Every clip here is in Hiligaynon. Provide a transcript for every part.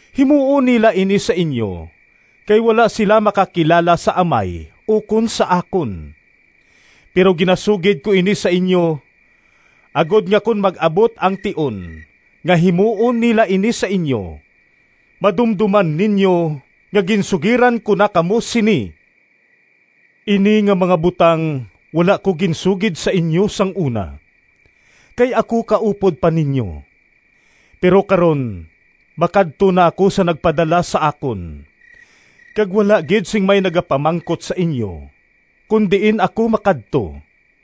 Himuon nila ini sa inyo, kay wala sila makakilala sa Amay ukon sa akon. Pero ginasugid ko ini sa inyo, agod nga kon mag-abot ang tion nga himuon nila ini sa inyo, madumdoman ninyo nga ginsugiran ko na kamo sini.” “Ini nga mga butang wala ko ginsugid sa inyo sang una, kay ako kaupod pa ninyo. Pero karon makadto na ako sa nagpadala sa akon, kag wala gid sing may nagapamangkot sa inyo kon diin ako makadto.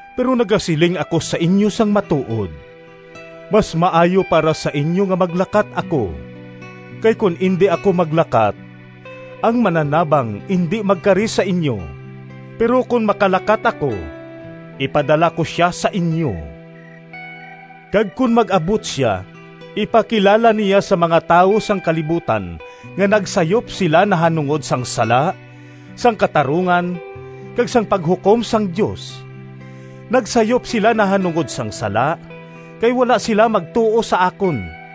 Pero nagasiling ako sa inyo sang matuod: mas maayo para sa inyo nga maglakat ako, kay kon indi ako maglakat, ang Mananabang indi magkari sa inyo. Pero kon makalakat ako, ipadala ko sia sa inyo. Kag kon mag-abot sia, ipakilala niya sa mga tawo sang kalibutan nga nagsayop sila nahanungod sang sala, sang katarungan, kag sang paghukom sang Dios. Nagsayop sila nahanungod sang sala, kay wala sila magtuo sa akon;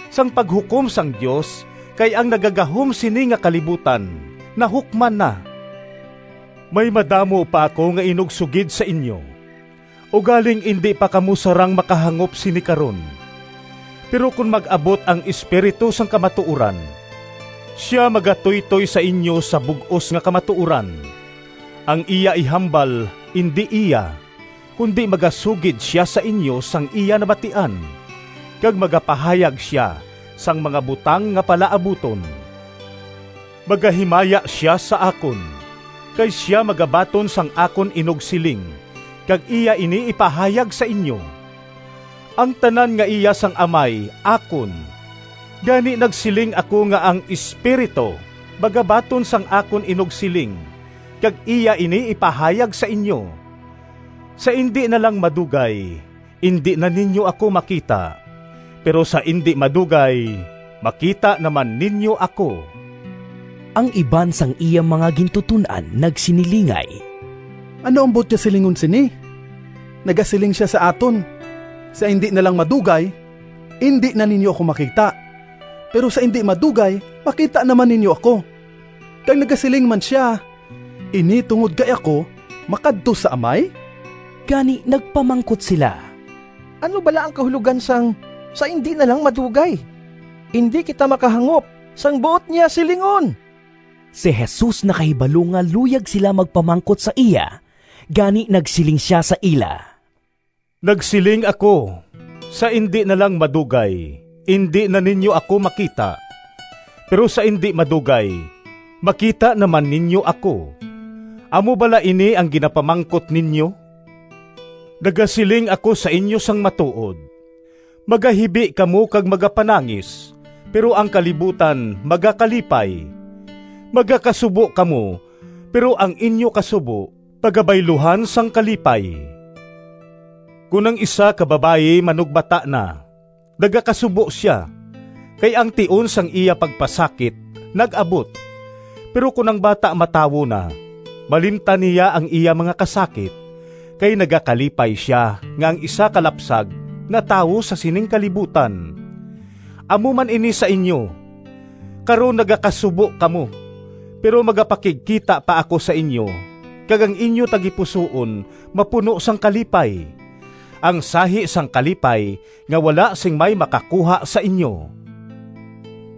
sang paghukom sang Dios, kay ang nagagahom sini nga kalibutan nahukman na. “May madamo pa ako nga inugsugid sa inyo, ugaling indi pa kamo sarang makahangop sini karon. Pero kon mag-abot ang Espiritu sang kamatuoran, sia magatuytoy sa inyo sa bug-os nga kamatuoran. Ang iya ihambal indi iya, kundi magasugid sia sa inyo sang iya nabatian, kag magapahayag sia sang mga butang nga palaabuton. Magahimaya sia sa akon, kay sia magabaton sang akon inugsiling kag iya ini ipahayag sa inyo. Ang tanan nga iya sang Amay akon, gani nagsiling ako nga ang Espiritu magabaton sang akon inugsiling kag iya ini ipahayag sa inyo.” “Sa indi na lang madugay indi na ninyo ako makita, pero sa indi madugay makita naman ninyo ako.” Ang iban sang iya mga gintuton-an nagsinilingay, “Ano ang buot niya silingon sini? Nagasiling sia sa aton, ‘Sa indi na lang madugay indi na ninyo ako makita, pero sa indi madugay makita naman ninyo ako,’ kag nagasiling man sia, ‘Ini tungod kay ako makadto sa Amay.’” Gani nagpamangkot sila, “Ano bala ang kahulogan sang, ‘Sa indi na lang madugay’? Indi kita makahangop sang buot niya silingon!” Si Jesus nakahibalo nga luyag sila magpamangkot sa iya, gani nagsiling sia sa ila, “Nagsiling ako, ‘Sa indi na lang madugay indi na ninyo ako makita, pero sa indi madugay makita naman ninyo ako.’ Amo bala ini ang ginapamangkot ninyo? Nagasiling ako sa inyo sang matuod: magahibi kamo kag magapanangis, pero ang kalibutan magakalipay. Magakasubo kamo, pero ang inyo kasubo pagabayluhan sang kalipay. Kon ang isa ka babayi manugbata na nagakasubo sia, kay ang tion sang iya pagpasakit nag-abot; pero kon ang bata matawo na, malimtan niya ang iya mga kasakit, kay nagakalipay sia nga ang isa ka lapsag natawo sa sining kalibutan. Amo man ini sa inyo. Karon nagakasubo kamo, pero magapakigkita pa ako sa inyo kag ang inyo tagipusoon mapuno sang kalipay, ang sahi sang kalipay nga wala sing may makakuha sa inyo.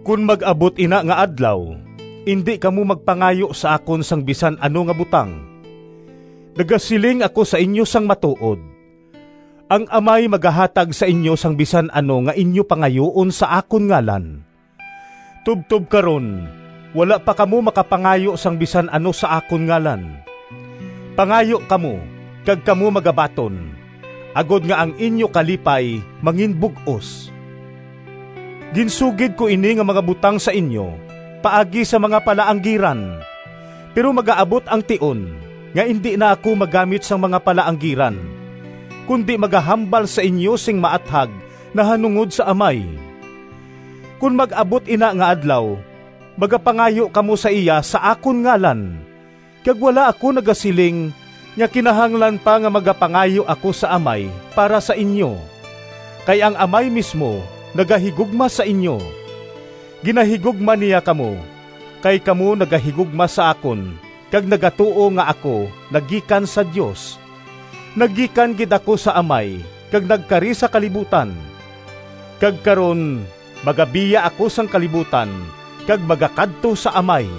“Kon mag-abot ina nga adlaw, indi kamo magpangayo sa akon sang bisan ano nga butang. Nagasiling ako sa inyo sang matuod: ang Amay magahatag sa inyo sang bisan ano nga inyo pangayuon sa akon ngalan. Tubtob karon wala pa kamo makapangayo sang bisan ano sa akon ngalan; pangayo kamo kag kamo magabaton, agod nga ang inyo kalipay manginbug-os.” “Ginsugid ko ini nga mga butang sa inyo paagi sa mga palaanggiran. Pero magaabot ang tion nga indi na ako maggamit sang mga palaanggiran, kundi magahambal sa inyo sing maathag nahanungod sa Amay. Kon mag-abot ina nga adlaw magapangayo kamo sa iya sa akon ngalan, kag wala ako nagasiling nga kinahanglan pa nga magapangayo ako sa Amay para sa inyo, kay ang Amay mismo nagahigugma sa inyo. Ginahigugma niya kamo kay kamo nagahigugma sa akon kag nagatuo nga ako nagikan sa Dios. Nagikan gid ako sa Amay kag nagkari sa kalibutan; kag karon magabiya ako sang kalibutan kag magakadto sa Amay.”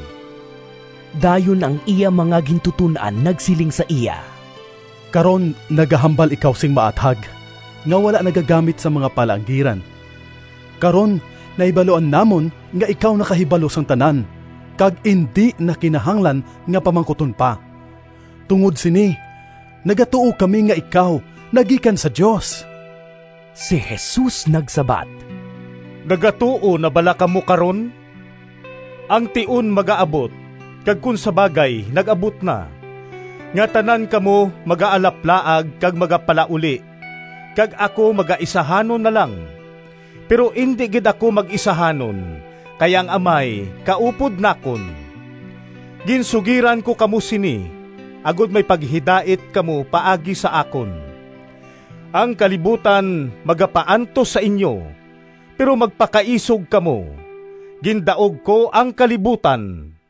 Dayon ang iya mga gintuton-an nagsiling sa iya, “Karon, nagahambal ikaw sing maathag nga wala nagagamit sang mga palaanggiran. Karon nahibaluan namon nga ikaw nakahibalo sang tanan kag indi na kinahanglan nga pamangkuton pa. Tungod sini nagatuo kami nga ikaw nagikan sa Dios.” Si Jesus nagsabat, “Nagatuo na bala kamo karon? Ang tion magaabot kag kon sa bagay nag-abot na, nga tanan kamo magaalaplaag kag magapalauli kag ako magaisahanon na lang. Pero indi gid ako mag-isahanon, kay ang Amay kaupod nakon. Ginsugiran ko kamo sini, agod may paghidait kamo paagi sa akon. Ang kalibutan magapaantos sa inyo, pero magpakaisog kamo! Gindaog ko ang kalibutan!”